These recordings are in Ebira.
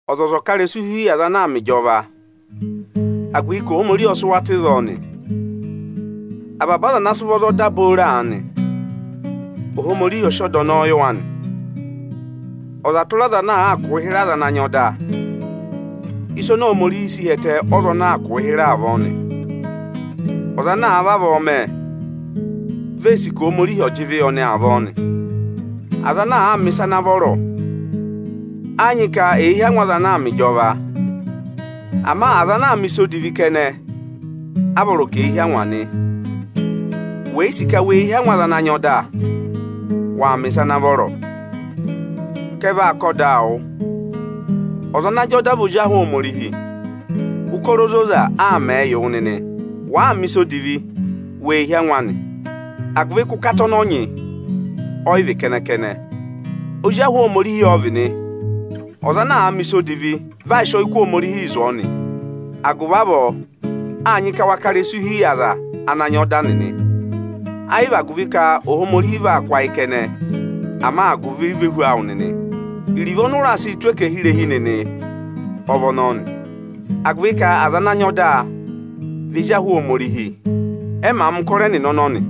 Ọzọza ọ̀ ká ịrẹsụ hi yị aza ana aa mẹ ịjọva, agụvị ka Ohomorihi ọ sị wa tụ́ ịzọọ nị. Avaba aza ana sị ụvọ za ọda booro aanị, Ohomorihi ọ sị ọda ọnọọ yị wa nị. Ọza tụra ọza ana àaa kụ̀ụ hịrẹ aza ana nyị ọda, ịsị Ohomorihi si hi ẹtẹ ọ́za ọnọọ aa kụ̀ụ hịrẹ avọọ nị. Ọza ana àa vavọọ mẹ, vi ee sì ka Ohomorihi ọ̀ jị ịvị yị ọnị avọọ nị. Aza ana àa mẹ̀ ịsa ana vọrọ, ẹ yị nyị ka èe hí angwa aza ana aa mẹ ịjọva. Ama aza ana àa mẹ̀ ịsa odivi kẹnẹ a vọrọ ka èe hí angwa nị. Wè yi sì ka wee hí angwa aza ana nyị ọda, waa mẹ̀ ịsa ana vọrọ, ka ẹ vaa kà ọdaa wụ. Ọza ana nyị ọda vị ozi ahụ Ohomorihi, ụkọrọ ozoza aa mẹẹ yị wụ nịnị nị. Wàa mẹ̀ ịsa odivi, wee hí angwa anị, agụvị ka ụkata ọnọọ nyị, ọyị vị kẹnẹ-kẹnẹ, ozi ahụ Ohomorihi ọ vị nị. Ọza ana àa mẹ̀ ịsa odivi, vị aa sị ọyịkụ Ohomorihi zụ̀ ọọ nị. Agụvị avọọ, â nyị ka wa ká ịrẹsụ hi yị aza ana nyị ọda nịnị, ayị vị agụvị ka Ohomorihi va kụ́ ayị kẹnẹ, ama agụvị ivehu awụ nịnị. Iruvo ọnị ụ raa sị tụ́ ẹkẹhị irehi nịnị, ọ vị ọnọọ nị, agụvị ka aza ana nyị ọda vị ezi ahụ Ohomorihi, ẹ màa mẹ̀ ụkọrọ ẹnịnị ọnọnị.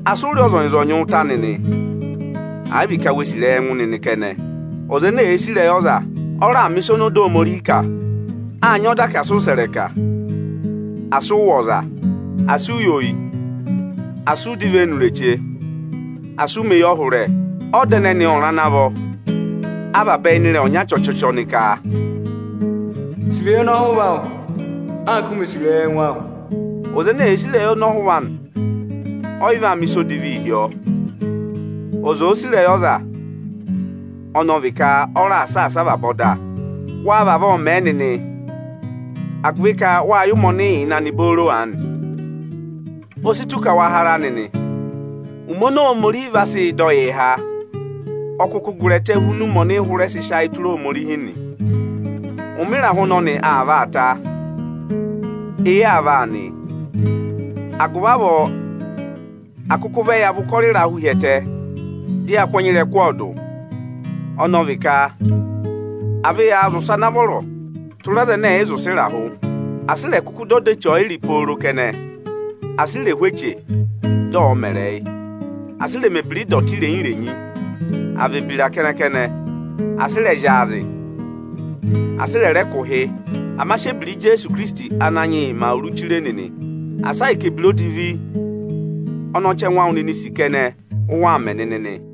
Asị ụ rị ọza ọnyọọnyị ụta nịnị, àyị vị ka wee sì ịrẹyị ẹngụ nịnị kẹnẹ! Ọza ene èe sì ịrẹyị ọza, ọ raà mẹ̀ ịsa ọnị ọda Ohomorihi kà. Â nyị ọda ka asị ụ sẹ̀ ịrẹka, asị ụ wụ̀ ọza, asị u yi oyi, asị ụ dọ ivenu ireche, asị ụ mẹ̀ eyọhụrẹ! Ọda ẹnẹnị ọnịrị ana vọ a vabẹ ịnị ịrẹyị ọnya chọchọchọ nịka: “Sì ịrẹyị ọnọhụva awụ, anka u mè sì ịrẹyị ẹngụ awụ!” Ọza ene èe sì ịrẹyị ọnọhụva anị, ọyị vaa mẹ̀ ịsa odivii hi ọọ. Ọza òo sì ịrẹyị ọza, ọnọọ vị ka ọ raà saasa avaba ọda. Wa vavọọ mẹ nịnị, agụvị ka wâ yẹ ụmẹ ọnị ị yà nịnị booro aanị! O si tù ka wa ha ara nịnị! Ụmẹ oni Ohomorihi vaa sị dọ yịị há, ọ kụkụ gụrị ẹtẹ hu ụmẹ ọnị ị hụrẹ sị sị ayị tụra Ohomorihi nị. Ụmẹ ịrahụ ọnọnị aa vaa ta, eyi aa vaa nị. Agụvị avọọ à kụkụ vẹ ya và ụkọrọ ịrahụ hi ẹtẹ, dị ya kụ́ ẹnya ịrẹkụ ọọdụ; ọnọọ vị ka à vẹ yaa zị ụsẹ ana vọrọ tụra aza ẹnẹ ẹ̀ yị zị ụsẹ ịrahụ! Asị ị rẹ̀ kụkụ dọ ọda eche ọyịrị pooro kẹnẹ! Asị i rè hú eche, dị ọ̀ọ mẹrị yị; asị ị rẹ̀ mẹ̀ ebira ịdọtị irenyi-renyi, àa vị ebira kẹnẹ-kẹnẹ! Asị ị rẹ̀ zyaazị; asị ị rẹ̀ rẹ kụ̀ ụhị! Ama sị ebira Ijeesu Ikirisiti Ananyị yị mẹ awuru chire nịnị, asa ahịka ebira odivi ọnị ọchẹngụ awụ nịnịị̄ sì kẹnẹ, ụ waa mẹ nịnị nị!